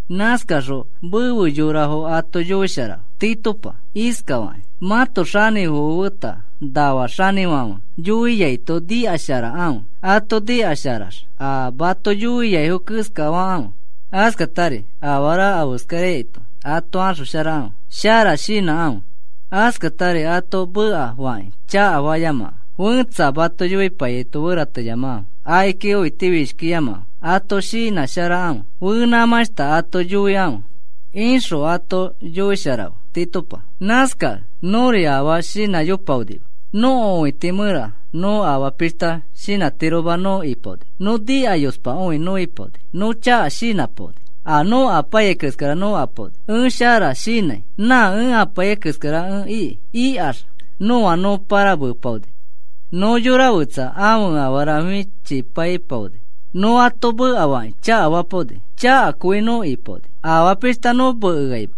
Nãskaxõ mefe yorafo ato yoisharafe, Titopa, iskafakĩ: “Mãto xanĩfofo feta nafa xanĩfãfe yoiaito nikasharakãfe. Ato nikasharax a mato yoiaifo keskakãfe. Askatari afara afeskaraito ato axosharakãfe. Shara shinãkãfe. Askatari ato mekafakĩ chakafayamakãfe. Fẽtsa mato yoipaiyaito ferateyamakãfe. Akiki õitifishkiyamakãfe. Ato shinãsharakãfe. Fenãmãshta ato yoikãfe,” ixõ ato yoisharafe, Titopa. Nãskakẽ nõri afaa shinãyopaonima. Nõko õiti mẽra nõ afaa pishta shinãtiroma nõ ipaoni. Nõ nikayospakõi nõ ipaoni. Nõ chaka shinãpaoni. A nã nõ ipaiyai keskara nõ ipaoni. “E shara shinãi, nã ẽ ipaiyai keskara ẽ iki,” ikax nõa nõ pãramepaoni. Nõ yora fetsa ãfe afara fichipaipaoni. Nõ ato mekafakĩ chakafapaoni. Chakakõi nõ ipaoni, afaa pishta nõ mekeaima.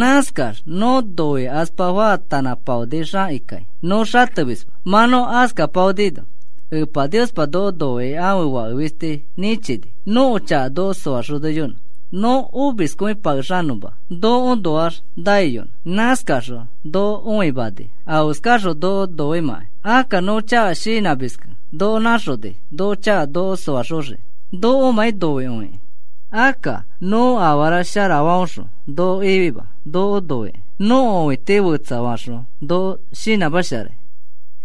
Nãskax nõ noikaspa faatanãpaonixakikai nõ xatemisma. Mã nõ askapaonino, Epa Niospa noko noikĩ ãfe Fake fisti nĩchini nõko chaka noko soaxoniyonõ, nõ omiskõipakexanõfoma nokoõnoax naiyonõ. Nãskaxõ noko õimani afeskaxõ noko noimãkai. Akka nõ chaka shinãmiskẽ noko nãxoni nõko chaka noko soaxoxiki, nokomãi noikõikĩ. Akka nõ afara shara faõxõ noko ifima. Noko noikĩ nõko õiti fetsafaxõ noko shinãmasharai.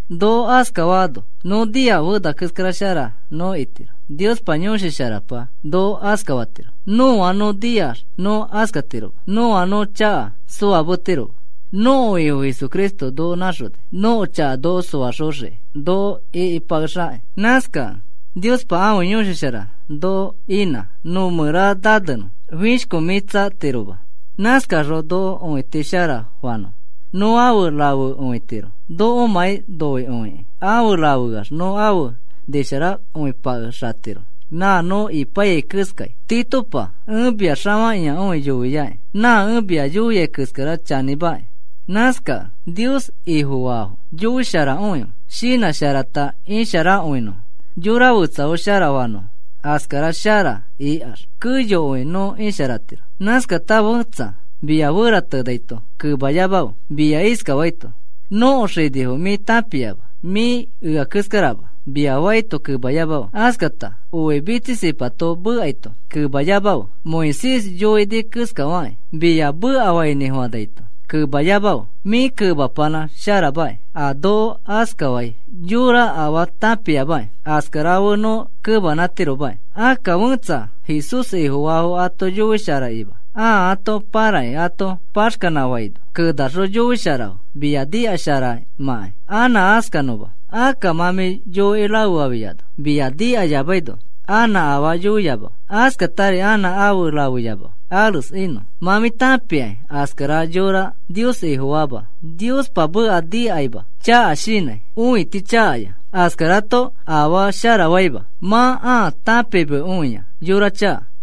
Noko askafaano nõ niax fena keskara shara nõ itiro. Niospa Yõshi Sharapa noko askafatiro. Nõa nõ niax nõ askatiroma. Nõa nõ chaka soametiroma. Nõko Ifo Jesucristo noko nãxoni, nõko chaka noko soaxoxiki noko ĩkipakexakĩ. Nãskakẽ Niospa ãfe Yõshi Shara noko inã nõ mẽra nanenõ, fishkomĩtsatiroma. Nãskaxõ noko õiti shara faano, nõ afe rafekõitiro nokomãi noikõikĩ. afe rafeax nõ afe nisharakõipakexatiro nã nõ ipaiyai keskai. Titopa, ẽ mia xafakĩakõi yoiaki. Nã ẽ mia yoiai keskara chanĩmaki. Nãskakẽ Nios Ifofaafo yoisharakõife, shinãsharata isharakõinõfo, yora fetsafo shara fanõfo. Askara shara ikax keyokõi nõ isharatiro. Nãskata fẽtsa mia feratenãito kemayamafe. Mia iskafaito: “Nõko xinifo mĩ tãpiama, mĩ ea keskarama,” mia faito kemayamafe. Askata oi mitsisipato mekaito kemayamafe. Moisés yoini keskafakĩ mia mekafainĩfofãnaito kemayamafe. Mĩ kemapanã sharamaki. A noko askafai yõra afaa tãpiamaki. Askara fe nõ kemanãtiromaki. Akka fẽtsa a Jesús Ifofaafo ato yoisharakima ãa ato pãrakĩ ato paxkanãfaino kenaxõ yoisharafe mia nikasharaimãkai anã askanõma. Akka mã mĩ yoikĩ rafefafiano mia nikayamaino anã afaa yoiyamafe. Askatari anã afe rafeyamafe, ares inõ. Mã mĩ tãpia askara yõra Nios Ifofaama. Niospa meka nikaima, chaka shinãi, õiti chakaya. Askarato afashta shara faima. Mã ãa tãpimekõia, yora chaka.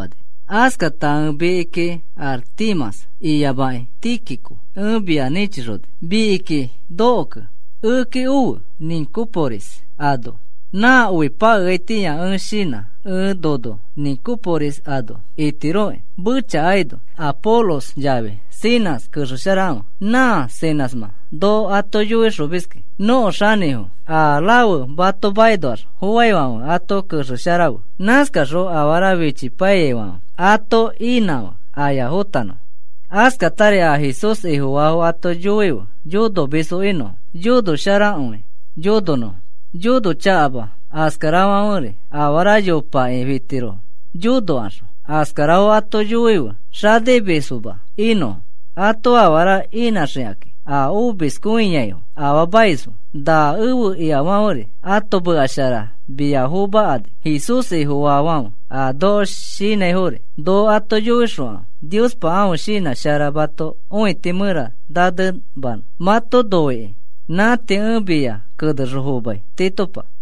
Askata ẽ mikiki Artemas iyamakĩ Tíquico ẽ mia nĩchixoni. Mikiki nokokẽ, ekeki ofe, Nicópolis ano. Na oi pakeaitĩa ẽ shinã ẽ nono Nicópolis ano itiroki, mechakaino. Apolos yafi Zenas kexesharafe. Nã Zenasmã noko ato yoixomiski, nõko xanĩfo. A rafe mato makinoax foaifãfe ato kexesharafe. Nãskaxõ afara fichipaiyaifãfe ato inãfe, aya fõtanõfo. Askatari a Jesús Ifofaafo ato yoife yonomisfo inõfo, yonosharakõi yononõfo, yonochakama. Askarafãferi afara yopakakĩ fitirofo, yonokaxõ. Askarafo ato yoife xanimisfoma inõfo, ato afara inãxikãki a omiskõiaifo, afaamaisfo. Na ẽfe ikafãferi ãto meka shara mia fomakani, Jesús Ifofaafãfe. A noko shinãifori noko ato yoixõfe. Niospa ãfe shinã shara mãto õiti mẽra nanemanõ mato noikõikĩ. Nã tii ẽ mia kenexõ fomai, Titopa. Pablo